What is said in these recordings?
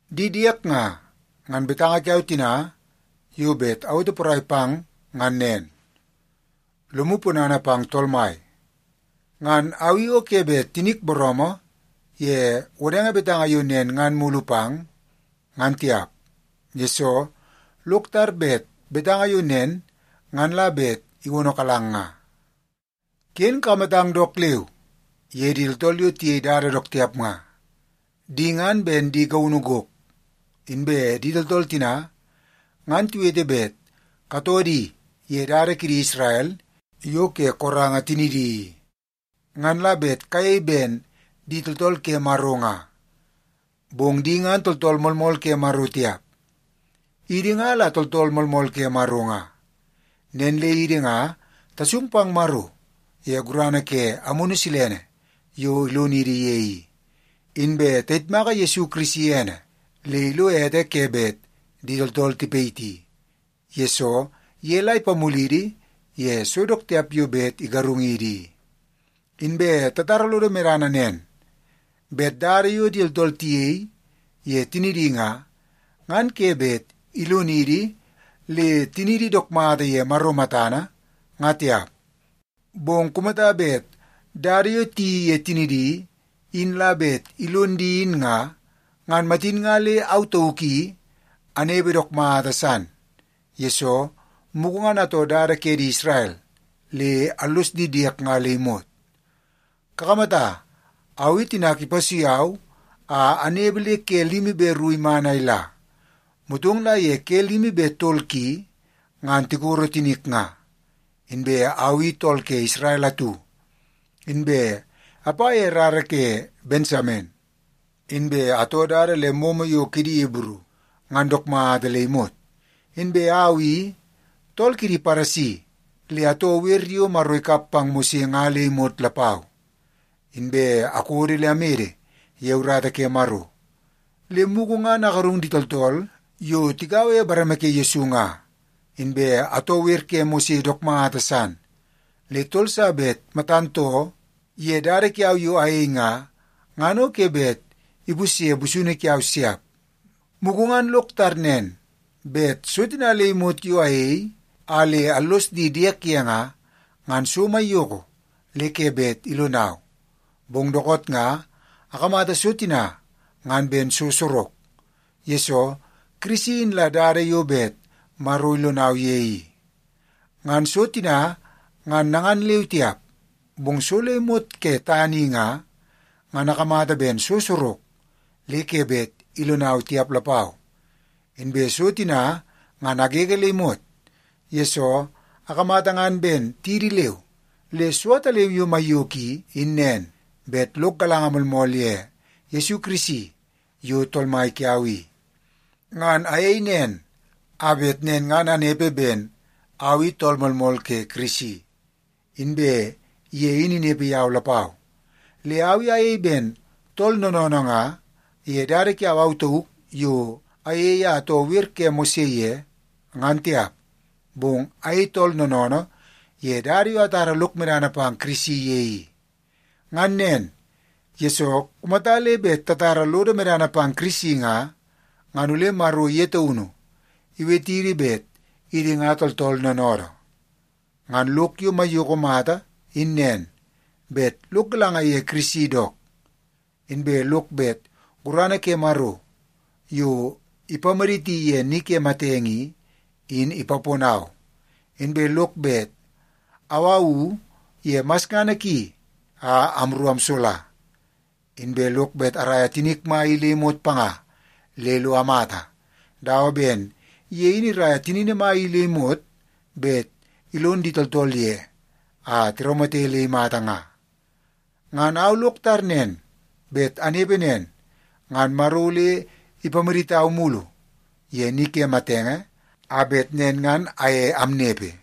Di diek nga, ngan betanga kiau tina yo bet awete porai pang ngan nen: Lomu ponana pang Tool Mai! Ngan au i o ke bet tinik booroomoo ye wodenge betanga yo nen ngan mulu pang, ngan tiap. Yesoo, lok tar bet betanga yo nen ngan la bet iwonokalang nga. Ken kakamatang dook leu ye di tooltool yo tiyei dada dook tiap nga. Di ngan ben di gaunu gok. Inbe di tooltool tina ngan tiwete bet katoo di ye dada kidi Isrel yo ke koranga tinidi i, ngan la bet kayei ben di tooltool ke Maro nga. Bong di ngan tooltool moolmool ke Maro tiap. Idi nga la tooltool moolmool ke Maro nga. Nen le idi nga tasung pang Maro ye gurana ke Amunu Silene yo ilonidi ye i. Inbe tayitmaka Yesu Kirisi ene le ilo ete ke bet di tooltool tipayiti, yesoo ye la ipamulidi ye so dook tiap yo bet igarungidi i. Inbe tatara lodo medana nen, bet dada yo di tooltool tiyei ye tinidi nga, ngan ke bet ilonidi le tiniidi dook mata ye Maro matana, nga tiap. Bong kumata bet dada yo tiyeii ye tinidi in la bet ilon di in nga, ngan matin nga le au tauk i anepe dook mata san, yesoo mugu ngan atoo dada ke di Isrel le allos di diek nga le imot. Kakamata, au i tinak ipasui au a anepe le ke limi be ru iman a ila, motong la ye ke limi be tol ki ngan tikoro tinik nga. Inbe au i tool ke Isrel atu, inbe apa ye rara ke Bensamen, inbe atoo dada le momo yo kidi Ibru ngan dook mata le imot. Inbe au i tool kidi Paresi le atoo wer yo Maro ikap pang Mose nga le imot lapau. Inbe akodo le amede ye urata ke Maro, le mugu ngan agarung di tooltool yo tigaua ye bareme ke Yesu nga. Inbe atoo wer ke Mose dook mata san, le tool sa bet matan too ye dada kiau yo ayei nga, ngan o ke bet ipusye busunu kiau siap. Mugu ngan lok tar nen bet so tina le imot yo ayei a le allos di diek ye nga, ngan so maiyoko le ke bet ilonau. Bong dookoot nga akamata so tina ngan ben so sorok, yesoo Kirisi in la dada yo bet Maro ilonau ye i. Ngan so tina ngan nangan leu tiap, bong so le imot ke tana i nga, ngan akamata ben so sorok le ke bet ilonau tiap lapau. Inbe so tina ngan agege le imot, yesoo akamata ngan ben tidi leu. Le so ataleu yo maiyoko i, in nen, bet lok galanga moolmool ye Yesu Kirisi yo Tool Mai kiau i. Ngan ayei nen a bet nen ngan anepe ben au i tool moolmool ke Kirisi, inbe ye in inepe yau lapau. Le au i ayei ben tool noonoonoo nga ye dada kiau au tauk yo ayei a atoo wer ke Mose ye, ngan tiap. Bong ayei tool noonoonoo ye dada yo atara lok medana pang Kirisi ye i. Ngan nen, yesoo kumata le bet tatara lodo medana pang Kirisi nga, ngan ole Maro ye taunu iwetidi bet idi nga tooltool noonoodoo. Ngan lok yo maiyoko mata in nen, bet lok galanga ye Kirisi dook. Inbe lok bet gurana ke Maro yo ipamaditi ye ni ke matenge i, in ipaponau. Inbe lok bet awawu ye masngana ki a amru amsola. Inbe lok bet araia tinik mai i le imot panga le lo amata, dawa ben ye in iraia tinini mai i le imot bet ilon di tooltool ye, a tiraumate le imata nga. Ngan au lok tar nen bet anepe nen, ngan Maro ole ipamaditau mulu ye ni ke matenge a bet nen ngan aye amnepe.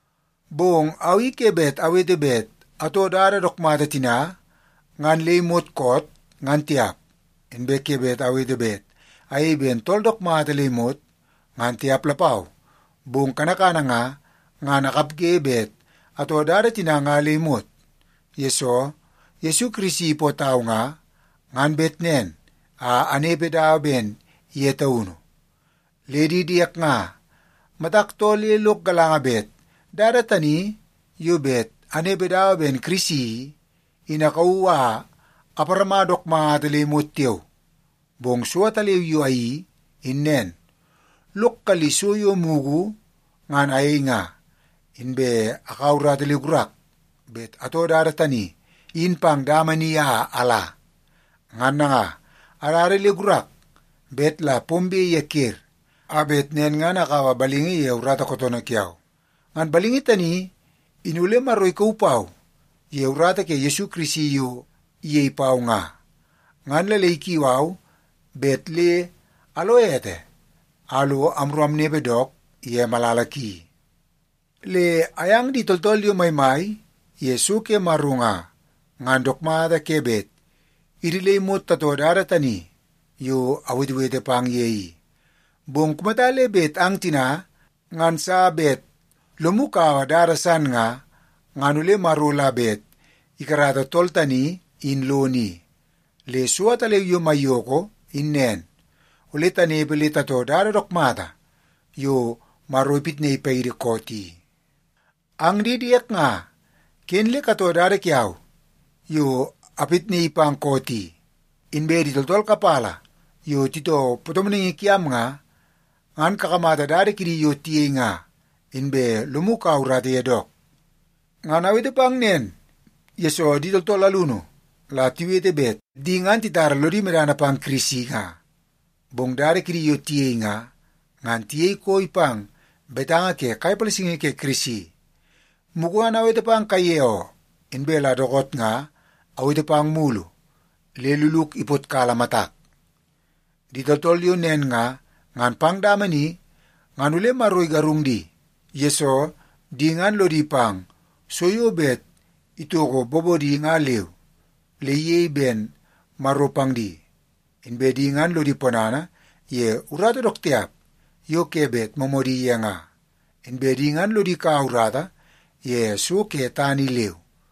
Bong au i ke bet awete bet atoo dada dook mata tina ngan le imot koot, ngan tiap. Inbe ke bet awete bet ayei ben tool dook mata le imot, ngan tiap lapau. Bong kanakana nga, ngan akapge bet atoo dada tina nga le imot, yesoo Yesu Kirisi ipootau nga, ngan bet nen a anepe dawa ben ye taunu. Le di diek nga, matak too le lok galanga bet dada tani yo bet anepe dawa ben Kirisi i, in akauu a aparama dook mata le imot tiao. Bong so ataleu yo ayeii, in nen; lok kalli so yo mugu ngan ayei nga, inbe akaua urata le gurak bet atoo dada tani in pang dama ni a ala. Ngan nanga, adada le gurak bet la pombe ye ker, a bet nen ngan akaua balingi ke urata kootoonoo kiau. Ngan balingi tani in ole Maro ikau pau ye urata ke Yesu Kirisi yo iyei pau nga, ngan la le ikiu au bet le alo ete a lo amru amnepe dook ye malala ki. Le ayang di tooltool yo maimai ye so ke Maro nga, ngan dook mata ke bet idi le imot tatoo dada tani yo awetewete pang ye i. Bong kumata le bet ang tina ngan sa bet lomu kaua dada san nga, ngan ole Maro la bet ikarata tool tani in lono i. Le so ataleu yo maiyoko in nen, ole tanepe le tatoo dada dook mata yo Maro ipitnaii paidi koot i. Ang di diek nga, ken le katoo dada kiau yo apitnaii pang koot i. Inbe di tooltool kapala yo titoo patomonaingi kiam nga, ngan kakamata dada kidi yo tiyei nga, inbe lomu kaua urata ye dook. Ngan awete pang nen, yesoo di tooltool alunu la tiwete bet di ngan titara lodi medana pang Kirisi nga, bong dada kidi yo tiyei nga, ngan tiyei koi pang betanga ke kai palasingi ke Kirisi. Mugu ngan awete pang kaiye oo, inbe la dookoot nga awete pang mulu le luluk ipotkala matak. Di tooltool yo nen nga, ngan pang dama ni ngan ole Maro igarung di, yesoo di ngan lodi pang so yo bet itoko bobodi nga leu, le iyei ben maro pang di. Inbe di ngan lodi ponana ye urata dook tiap yo ke bet moomoodi ye nga. Inbe di ngan lodi kaua urata ye so ke tana i leu.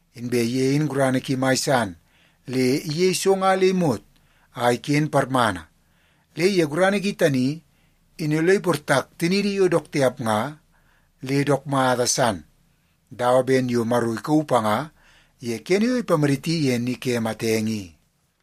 Inbe ye in gurana ki mai san le iyei so nga le imot a iken parmana. Le ye gurana ki tani, in ole iportak tiniidi yo dook mata tiap nga, le dook mata san dawa ben yo Maro ikauu panga ye kene yo ipamaditi ye ni ke matenge i.